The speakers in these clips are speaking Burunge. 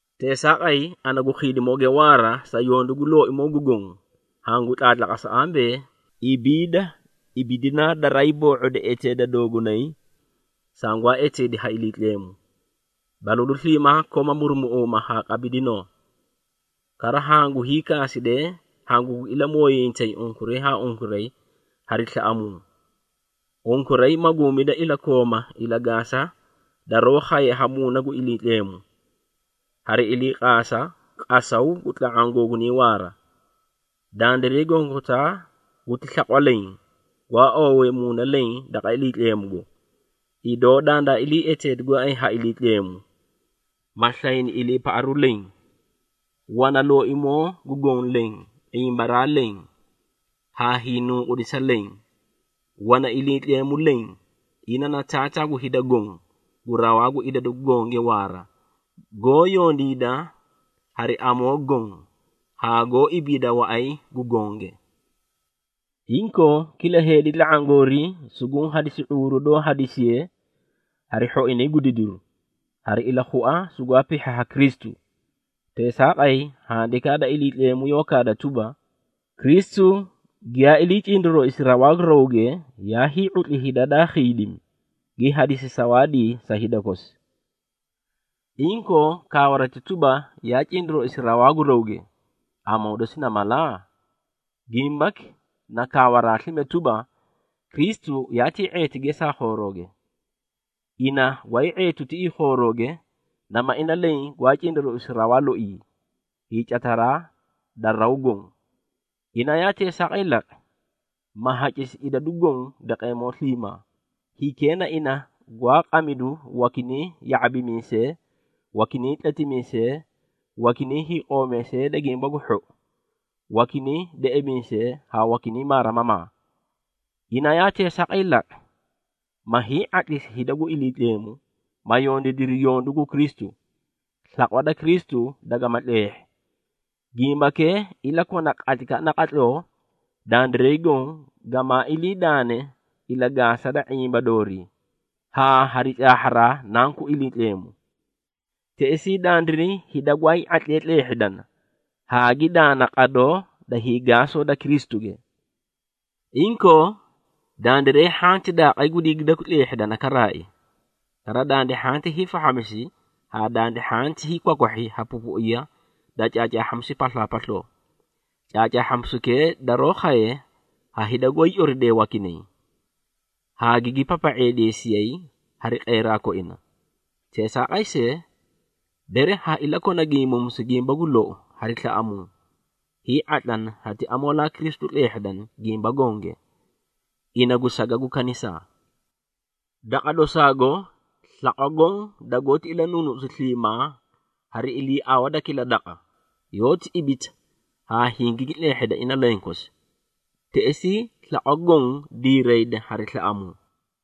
Teesaaqay, ana gu khiidimooge waara, sa yondu gu Looimoo gu Goõ, hangu tlaatlaqasa ambee, ibiida ibidinaa daraay boo⁄odi eteeda doogunay, sangwaa eteedi ha Iliitleemu. Balalu sliimaa kooma murumuꞌuumaa haa qabidinoo. Kara, hangu hiikaasidee hangugi ilamooyiyintay unkuray haa unkuray hari slaꞌamuu. Unkuray maguumida iliikooma ilagaasa daroó khaye ha Muuna gu Iliitleemu, hari iliiqaasa qasaw gu tla⁄aã googunay waara. Dandiray gonkotaa guti slaqwa leẽ gwaa oowee Muuna leẽ daqa Iliitleemugo, idoo dandaa ilii eteedi gooay ha Iliitleemu, ma slayni iliipaꞌaru leẽ. Wana Looimoo gu Goõ leẽ, ⁄imbaraa leẽ, haa hiinunqudisa leẽ. Wana Iliitleemu leẽ, ina na Taataa gu hida goõ, gu rawaa gu idadu gonge waara, goó yondiida hari amoo goõ, haa goó ibiida waꞌay gu gonge. Inkoo, kila heedi tla⁄aã goorii suguũ hadisi ⁄uuru doó hadisiye hari hhoinay gu didiru, hari ilakhua sugwaa pihhi ha Kristu. Teesaaqay, Handikaa da Iliitleemu yoó kaada tuba, “Kristu giyaa ilii cindarooisi rawaa gu rawge, yaa hii⁄utli hida daa khiidimi, gi hadisi sawaadii sa hida kosi.” Inkoo, kaawarati tuba, “Yaa cindarooisi rawaa gu rawge,” amoo dosi na mala? Gimbaki, na kaawaraa slime tuba, Kristu yaatii ⁄eeti gesaa khoorooge. Ina gwaay ⁄eetu tiꞌii khoorooge, nama ina leẽ gwaa cindarooisu rawaa loii, hiicataraa da raw goõ. Ina yaa teesaaqay laqi, ma hacisi idadu goõ daqeemoo sliimaa. Hikee na ina gwaa qamidu wakinay ya⁄abimiisee, wakinay tletimiisee, wakinay hiiqoomiisee da Gimba gu Hhou, wakinay deꞌemiisee haa wakinay maarimamaa. Ina yaa teesaaqay laqi, ma hii⁄atlisi hida gu Iliitleemu, ma yondiidiri yondu gu Kristu, slaqwa da Kristu dagama tleehhi. Gimbakee ilakona qatlaykaꞌa naqatloo, dandiray goõ gamaa iliidaane ilagaasa da ⁄imba doorii, haa hari caahharaa Nanku Iliitleemu. Teꞌesii, dandiray hida gwaay ⁄atlee tleehhidana, haa gi daana qadoo da hiigaasa da Kristuge. Inkoo, dandiray hhanti daaqay gu digidakwi tleehhidana karaai. Kara, dandi hhanti hiifahhamisi haa dandi hhanti hiikwakwahhi ha pupuiya da caacaahhamisu paslaapasloo. Caacaahhamisukee daroó khaye ha hida goó hiicoridee wakinay, haa gigi papa⁄eedeesiyay hari qeeraa koina. Teesaaqay see, bere ha iliikona gimbuumisu gimba gu lou hari slaꞌamuu, hii⁄atlana hati amoolaa Kristu tleehhidana gimba gonge, ina gu saga gu kanisaa. Daqa dosaago, slaqwa goõ dagoóti ilanuunuꞌusi sliimaa hari iliiawa da kila daqa, yoóti ibita haa hingigi tleehheda ina lenkosi, teꞌesii slaqwa goõ diirayda hari slaꞌamuu.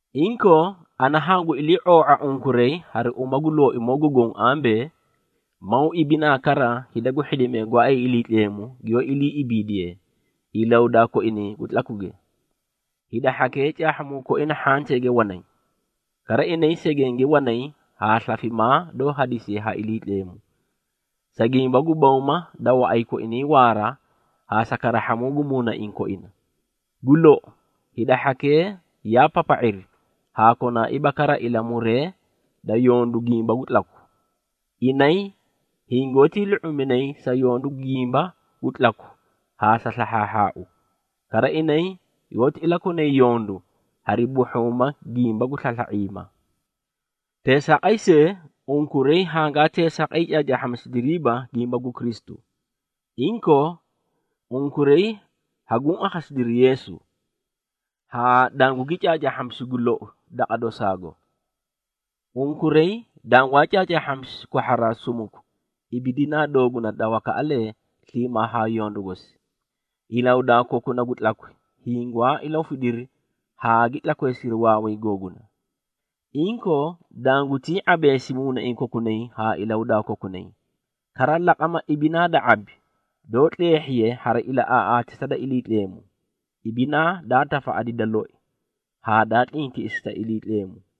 Inkoo, ana hangu ilii⁄oo⁄a unkuray hari uma gu Looimoo gu Goõ ambee, maw ibinaa kara hida gu hhidimee gooay Iliitleemu giyoó iliiꞌibiidiyee, ilahudaa koinay gu tlakwige. Hida hhakee caahhamuu koina hhanteege wanay. Kara inay segenge wanay haa slafimaa doó hadisiye ha Iliitleemu, sa gimba gu bawma da waꞌay koinay waara haa sa karahhamuu gu muunaiĩ koina. Gu lou, hida hhakee yaa papa⁄iri haa konaaiiba kara ilamuree da yondu gimba gu tlaku. Inay hingoótii lu⁄uminay sa yondu gimba gu tlaku haa gu slahhaahhaau. Kara, inay yoóti ilakonay yondu hari buhhuuma gimba gu slasla⁄iima. Teesaaqay see, unkuray hangaa teesaaqay caacaahhamisidiriiba gimba gu Kristu. Inkoo unkuray haguũ akhasidiri Yeesu, haa dangugi caacaahhamisi gu lou daqa dosaago. Unkuray dangwaa caacaahhamisi kwahharaa sumuku ibidinaa dooguna da wakaꞌalee sliimaa haa yondu gosi. Ilahudaa kokuna gu tlakwi hingwaa ilahufidiri haa gi tlakweemisiri waaway googuna. Inkoo, dangutii ⁄abeesi muunaiĩ kokunay haa ilahudaa kokunay. Kara laqama ibinaa da ⁄abi, doó tleehhiye hari ilaꞌaaꞌaatisa da Iliitleemu, ibinaa daa tafaꞌadi da loi haa daa tlintiꞌisi sa Iliitleemu.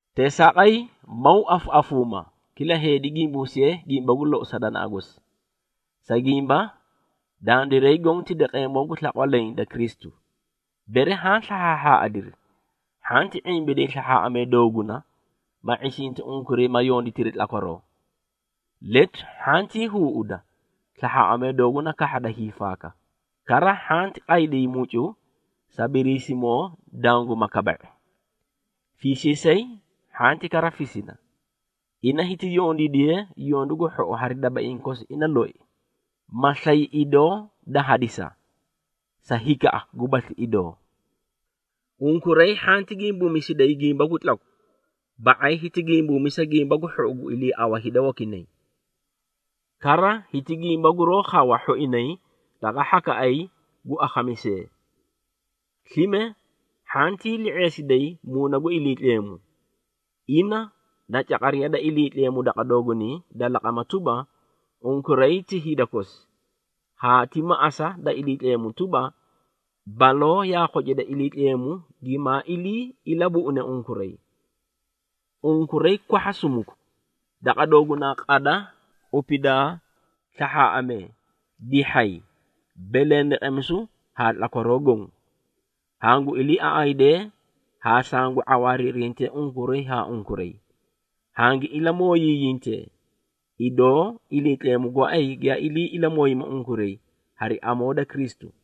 Teesaaqay, maw afaꞌafuumaa, kila heedi gimbuusiye gimba gu lou sa danaꞌa gosi. Sa gimba, dandiray goõ ti daqeemoo gu slaqwa leẽ da Kristu. Bere haã slahhaahhaaꞌadiri, hhanti ⁄imbiday slahhaaꞌamee dooguna, ma ⁄isinti unkuray ma yonditiri tlakwaroo. Letu hhantii huuda slahhaaꞌamee dooguna kahhada hiifaaka. Kara, hhanti qayday mucu sa Biriisimoo danguma kaba⁄i. Fiisiisay hhanti kara fisina, ina hiti yondiidiye yondu gu hhou hari dabaiĩ kosi ina loi, ma slay idoo da hadisa sa hikaꞌa gubasli idoo. Unkuray hhanti gimbuumisiday gimba gu tlaku, ba⁄ay hiti gimbuumisa gimba gu hhou gu iliiawa hida wakinay. Kara, hiti gimba guroó khawa hhoinay daqa hhakaꞌay gu akhamisee. Slime hhantii li⁄eesiday Muuna gu Iliitleemu, ina na caqariya da Iliitleemu daqa doogunay da laqama tuba, unkuray ti hida kosi, haa ti maꞌasa da Iliitleemu tuba, baloo yaa khocida Iliitleemu gimaa ilii ilabuꞌune unkuray. Unkuray kwahha sumuku daqa doogunaa qada, qupidaa, slahhaaꞌamee, dihhay, belendeqemisu haa tlakwaroo goõ. Hangu iliiaꞌaydee haa sangu ⁄awaariirintee unkuray haa unkuray. Hangi ilamooyiyintee, idoo Iliitleemu gooay giyaa ilii ilamooyimi unkuray hari amoo da Kristu.